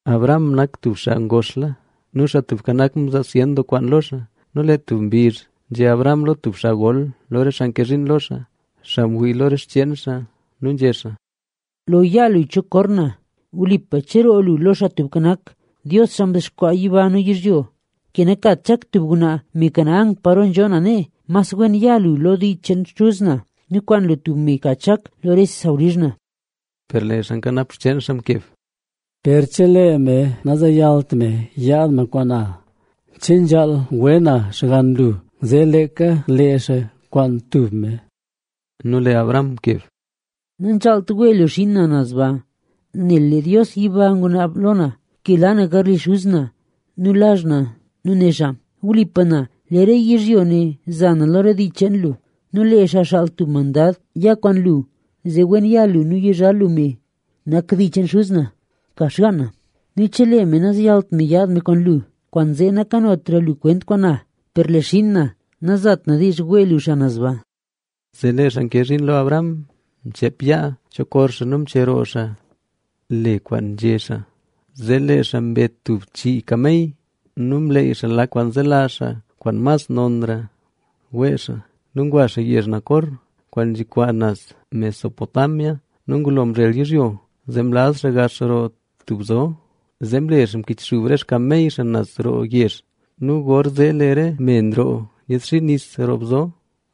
Abraham nak tub xaa ngoxla nu Xaa Tubka Nak mzaa zyen doo kwaan lo xaa. Nu lee tub mbizh nzhé Abraham lo tub xaa gol lo rese xaa nke zhiin lo xaa, xaa ngwii lo re xcheen xaa nu nzhé xaa: —Cheep yaa lu cho kor na. Wlipa cheroo lu lo Xaa Tubka Nak, Dios, xaa mdexkwaa yiba nu yizhyo, ke nakat Chak tub ngwnaa me Canaán, paro nzho na nee. Mas wen ya lu lo dii cheen xuz na nu kwaan lu tub me ka Chak lo re sawlizh na. Per lee xaa nkanap xcheen xaa mkeb: —Per chelee me nazeyalt me yaad me kwaan na, ¿che nzhaal we na xgann lu zee leeka lee xaa kwaan tub me? Nu lee Abraham mkeb: —Nanzhaalt wee lu xiin na naz ba. Nel lee Dios yiba ngunaab lo na ke la na garli xuz na nu lazh na nu né xaa: “Wlipa na, lee re yizhyo ne za na lo re dii cheen lu”. Nu lee xaa xaal tub mandad ya kwaan lu zee wen ya lu nu yizhal lu me nak dii cheen xuz na, ka xgaan na. Nu chelee me nazeyalt me yaad me kwaan lu, kwaanzee nakanotra lu kwent kwaan na. Per lee xiin na nazat na diizh wee lu xaa naz ba. Zee lee xaa nke zhiin lo Abraham mcheep yaa cho kor xaa nu mcheroo xaa le xaa kwaan nzhé xaa. Zee lee xaa mbe tub chii kamey nu mleey xaa lak kwaan zelazh xaa kwaan mas nonra wee xaa nu ngwa xaa yezh Nacor, kwaan nzhi naz Mesopotamia. Nu ngulo mzhel yizhyo, zee mlaz xaa gax roo tub bzo, zee mle xaa mkichxub re xkamey xaa naz roo yezh. Nu gorzee lee re me nroo nyiidxii nis roo bzo.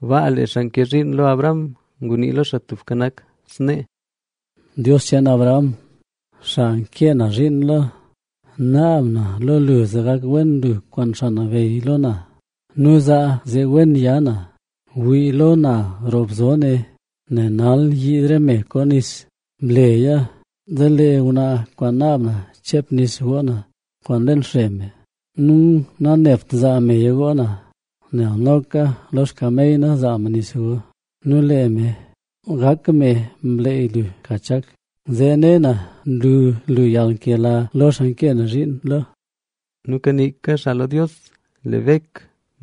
Baa lee xaa nke zhiin lo Abraham ngunii lo Xaa Tubka Nak snee: —Dios cheen Abraham, xaa nkee na zhiin lo, naab na lo lu zee gak wen lu kwaan xaa nabeyy lo na nu lee zee wen ya na. Wii lo na roo bzo ne, lee nal nyiid re me koo nis. Bleya zee lee ngwnaa kwaan naab na cheep nis goo na kwaan leen xre me nu nanebt zaa meya goo na, nel noka lo xkamey na zaa me nis go. Nu lee me, gak me mleey lu ka Chak, zee ne na nlu lu yalnkela lo xaa nkee na zhiin lo. Nu kaniika xaa lo Dios, lee Bek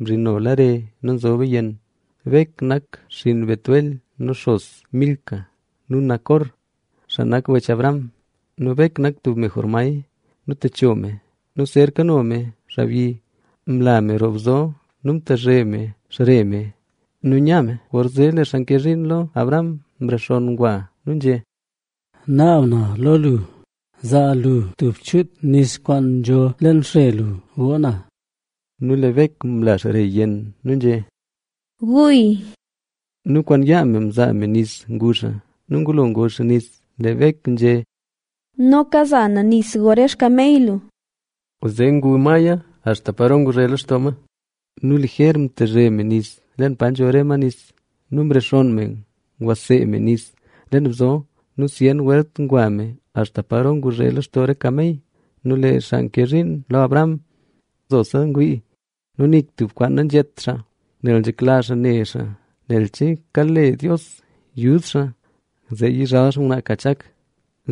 mzhinola re nu nzoba yenn. Bek nak xinn Betuel nu xos Milca nu Nacor, xaa nak wech Abraham. Nu Bek nak tub me jormay nu techo me nu zer kano me xaabyi. Mla me roo bzo nu mtazhe me xre me nu nya me. Gorzee lee xaa nke zhiin lo Abraham, mrexonn ngwa nu nzhé: —Naab na lo lu, zaa lu tub chuut nis kwaan nzho leen xre lu goo na. Nu lee Bek mla xre yenn nu nzhé: —Guya. Nu kwaan yaa me mzaa me nis ngu xaa. Nu ngulo ngu xaa nis, lee Bek nzhé: —Noka za na nis go re xkamey lu. Zee ngu maya axta paro nguzhe lextoo ma. Nu lijer mtazhe me nis leen pa nzho re ma nis. Nu mrexonn me ngwasee me nis leen bzo nu zyen welt ngwa me axta paro nguzhe lextoo re xkamey xaa. Nu lee xaa nke zhiin lo Abraham nzose ngwii nu nik tub kwaan nanzhét xaa, nel nzhekla xaa ne xaa nel chelee kale Dios yud xaa, zee yizhal xaa ngwnaa ka Chak.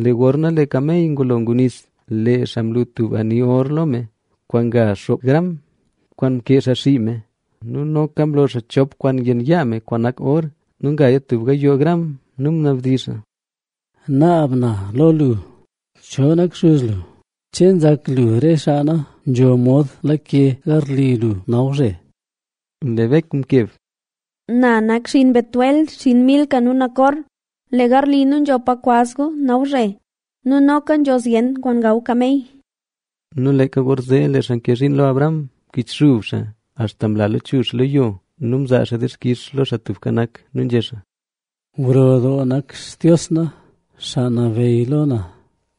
Lee gorna lee kamey ngulo ngu nis, lee xaa mlu tub ani or lo me kwaan nga xoopgram kwaan mkee xaa xii me nu noka mlo xaa chop kwaan yenn yaa me kwaan nak or nu ngaya tub gayoo gram. Nu ngunabdizh xaa: —Naab na lo lu, ¿cho nak xuz lu? ¿Che nzak lu re xaa na nzho mod lake garli lu nawzhe? Lee Bek mkeb: —Na nak xinn Betuel, xinn Milca nu Nacor. Lee garli nu nzho pa kwaz gu nawzhe nu noka nzho zyen kwaan gaw kamey. Nu leeka gorzee lee xaa nke zhiin lo Abraham mkichxub xaa axta mla lachuzh xaa lo yo nu mzaa xaa dixkix lo Xaa Tubka Nak. Nu nzhé xaa: —Wen doo nak Xaa Tubka Nak, Dios xaa nabeyy lo na.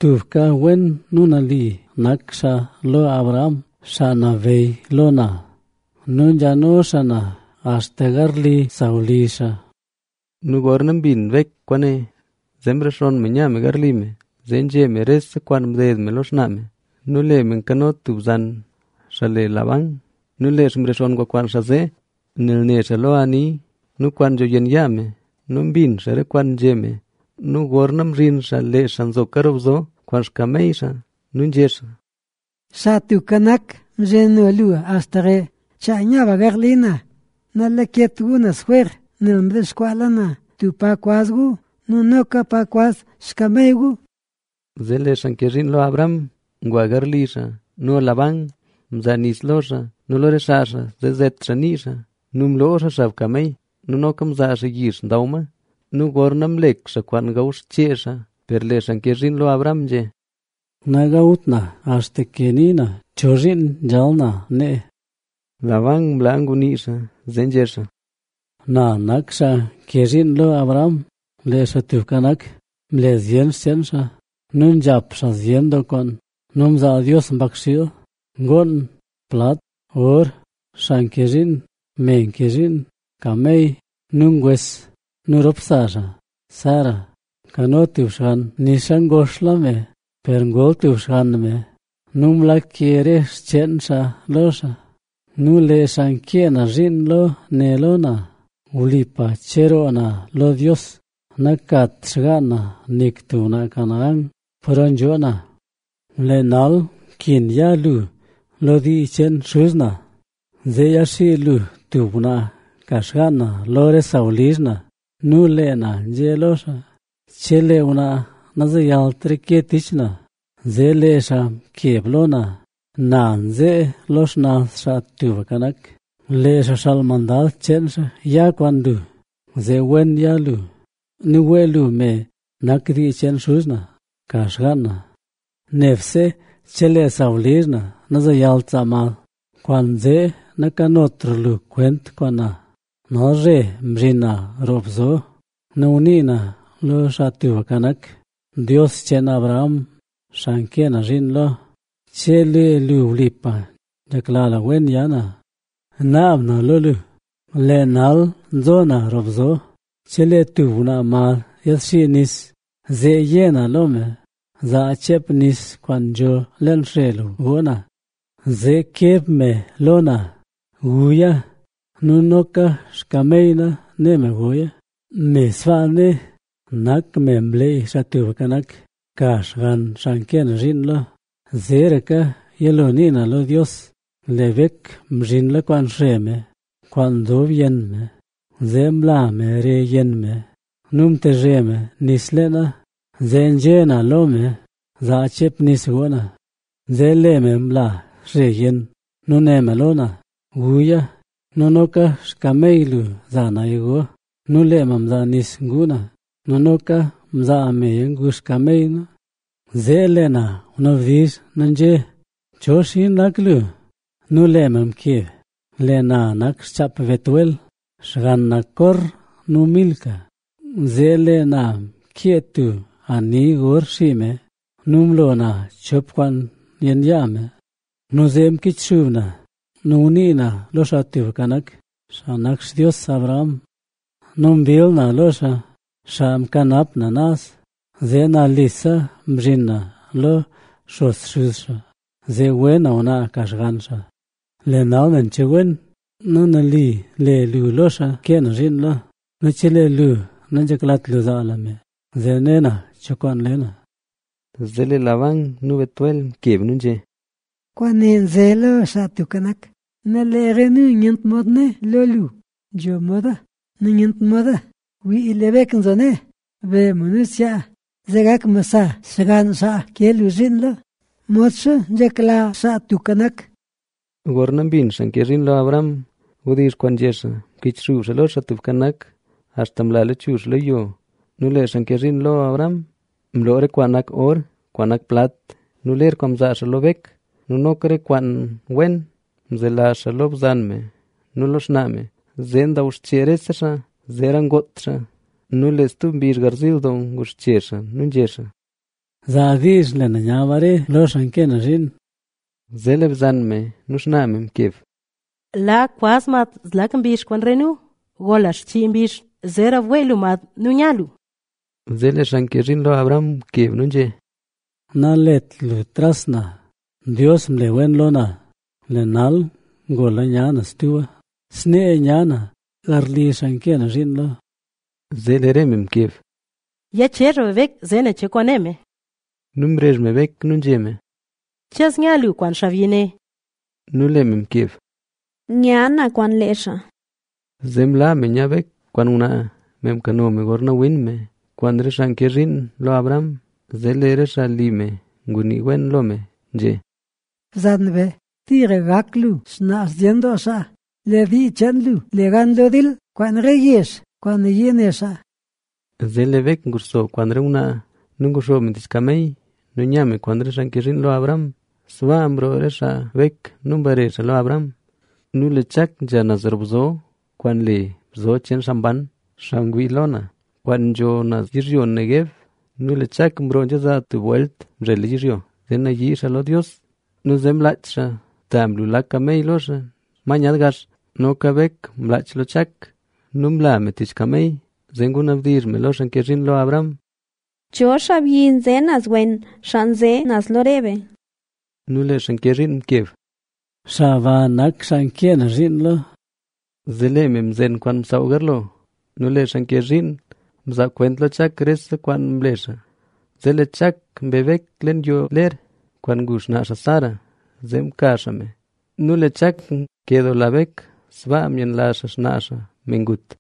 Tubka wen nu nali nak xaa lo Abraham, xaa nabeyy lo na. Nu nzhano xaa na axta garli sawlizh xaa. Nu gorna mbin Bek kwaane, zee mrexonn me nya me garli me. Zee nzhé me rese kwaan mded me lo xnaa me. Nu lee me mkano tub bzan, xaa le Labán nu lee xaa mrexonn ngwa kwaan xaa zee, nel ne xaa lo ani nu kwaan nzho yenn yaa me nu mbin xaa re kwaan nzhé me. Nu gorna mzhin xaa lee xaa nzoka roo bzo kwaan xkamey xaa. Nu nzhé xaa: —Xaa Tubka Nak mzhino lu axta re. Chaa nya be garli na. Nalaket lu naz jwer, nel mdexkwaala na tub pa kwaz lu nu noka pa kwaz xkamey lu. Zee lee xaa nke zhiin lo Abraham ngwa garli xaa; nu Labán mzaa nis lo xaa nu lo re xaa xaa zee zet xaa nii xaa. Nu mloo xaa xab kamey nu noka mzaa xaa yix ndaw ma. Nu gorna mlek xaa kwaan gaw xchee xaa, per lee xaa mke zhiin lo Abraham nzhé: —Nagawt na axta ke nii na chozhiin nzhal na nee. Labán mlaa ngunii xaa. Zee nzhé xaa: —Na nak xaa nke zhiin lo Abraham. Lee Xaa Tubka Nak mle zyen xcheen xaa nu nzhap xaa zyen doo kwaan. Nu mzaa Dios mbakxiil, ngoon, plat, or, xaa nke zhiin, me nke zhiin, kamey nu ngwes. Nu rop sa xaa Sara mkano tub xgann nixa ngoxla me, per ngol tub xgann me nu mlake re xcheen xaa lo xaa. Nu lee xaa nkee na zhiin lo né lo na: “Wlipa nakat xgaan na nik tub ngwnaa Canaán, paro nzhoo na. Lee nal nkin ya lu lo dii cheen xuz na, zee yaxii lu tub ngwnaa ka xgaan na lo re sawlizh na.” Nu lee na nzhé lo xaa: “Chelee ngwnaa nazeyalt reke tich na”. Zee lee xaa mkeb lo na: “Na nzee lo xnaz Xaa Tubka Nak, lee xaa xaal mandad cheen xaa ya kwaan lu, zee wen ya lu nu wee lu me nak dii cheen xuz na ka xgaan na. Nebse chelee sawlizh na nazeyalt zaa mad, kwaanzee nakanotra lu kwent kwaan na.” Nalzhe mzhin na roo bzo nu ngunii na lo Xaa Tubka Nak: “Dios cheen Abraham, xaa nkee na zhiin lo, chelee lu wlipa nzhekla lu wen ya na, naab na lo lu, lee nal nzo na roo bzo, chelee tub ngwnaa mad yiidxi nis, zee yé na lo me: “Zaa cheep nis kwaan nzho leen xre lu goo na.” Zee keb me lo na: “Guya” nu noka xkamey na né me goya, me sbaa né nak me mleey Xaa Tubka Nak ka xgann xaa nkee na zhiin lo. Zeeraka yilo nii na lo Dios, lee Bek mzhinla kwaan xre me kwaan nzob yenn me. Zee mla me re yenn me nu mtezhe me nis leena, zee nzhé na lo me: “Zaa cheep nis goo na”. Zee lee me mla xre yenn nu né me lo na: “Guya. Nu noka xkamey lu za naya go.” Nu lee me mzaa nis ngu na nu noka mzaa meya ngu xkamey na, zee lee na ngunabdizh nu nzhé: “¿Cho xinn nak lu?” Nu lee me mkeb: “Lee na nak xchaap Betuel, xgann Nacor nu Milca”. Zee lee na mkee tub ani or xii me nu mlo na chop kwaan yenn yaa me. Nu zee mkichxub na ngunii na lo Xaa Tubka Nak, xaa nak Xtios Abraham nu mbill na lo xaa, xaa mkanap na naz zee nalise mzhin na lo xos xuz xaa, zee we na ngwnaa ka xgann xaa. Lee nal nen che wen nu nali le lu lo xaa nkee na zhiin lo; nu chelee lu nanzheklat lu zaa lu me zee ne na cho kwaan le na”. Zee lee Labán nu Betuel mkeb nu nzhé: —Kwaane nze lo Xaa Tubka Nak nu lee re nu nyent mod né lo lu “Nzho moda nu nyent moda”. Wii, lee Bek nzho nee, be me nu zyaa, zee gak me sa xgann xaa nke lu zhiin lo, modxa nzhekla Xaa Tubka Nak. Gorna mbin xaa nke zhiin lo Abraham wdizh kwaan nzhé xaa, mkichxub xaa lo Xaa Tubka Nak, axta mla lachuzh xaa lo yo. Nu lee xaa nke zhiin lo Abraham mlo re kwaan nak or, kwaan nak plat nu ler kwaan mzaa xaa lo Bek. Nu noka re kwaan wen mzelazh xaa lo bzan me nu lo xnaa me. Zee ndaw xchee rese xaa, zeera ngoot xaa. Nu lee stub mbizh garziil doo nguxche xaa nu nzhé xaa: —Zaa diizh bare na lo xaa nkee na zhiin. Zee lee bzan me nu xnaa me mkeb: —Laa kwaz mad zlak mbizh kwaan re nu, gola xchii mbizh, zeera wee lu mad nu nya lu. Zee lee xaa nke zhiin lo Abraham mkeb nu nzhé: —Nalet lu tras na, Dios mle wen lo na, lee nal ngola nya na stuba. Snee nya na garli xaa nkee na zhiin lo. Zee lee re xaa mkeb: —Ya chezh be Bek, zee nen cho kwaan né me. Nu mrezh me Bek nu nzhé me: —¿Che zya lu kwaan xaabyi ne? Nu lee me mkeb: —Nya na kwaan lee xaa. Zee mlaa me nya Bek kwaan ngwnaa, me mkano me gorna win me, kwaan re xaa nke zhiin lo Abraham. Zee lee re xaa li me ngunii wen lo me, nzhé: Bzan be, tira gak lu xnaa zyen doo xaa, lee dii cheen lu le gan lo dil kwaan re yezh kwaan nayii ne xaa. Zee lee Bek nguxso kwaan re ngwnaa nu nguxoob me tich kamey nu nya me kwaan re xaa nke zhiin lo Abraham. Sbaa mroo re xaa Bek nu mbare xaa lo Abraham. Nu lee Chak nzha naz roo bzo kwaan le Bzo cheen Xaa Mban, xaa ngwii lo na,a kwaan nzho naz yizhyo Neguev. Nu lee Chak mroo nzha zaa tub welt mzhela yizhyo, zee yanii xaa lo Dios. Nu zee mlaach xaa, ta mlu lak kamey lo xaa, ma nyaad gax. Noka Bek mlaach lo Chak nu mla me tich kamey. Zee ngunabdizh me lo xaa nke zhiin lo Abraham: —¿Cho xaabyi nze naz wen, xaa nze naz lo re be? Nu lee xaa nke zhiin mkeb: —Xaa ba nak xaa nkee na zhiin lo. Zee lee me mzen kwaan msaaw garlo. Nu lee xaa nke zhiin mzaa kwent lo Chak rese kwaan mle xaa. Zee lee Chak mbe Bek leen yoo ler kwaan ngu xnaa xaa Sara, zee mka xaa me. Nu lee Chak nkedoola Bek. Sbaa myenlazh xaa xnaa xaa, me ngut.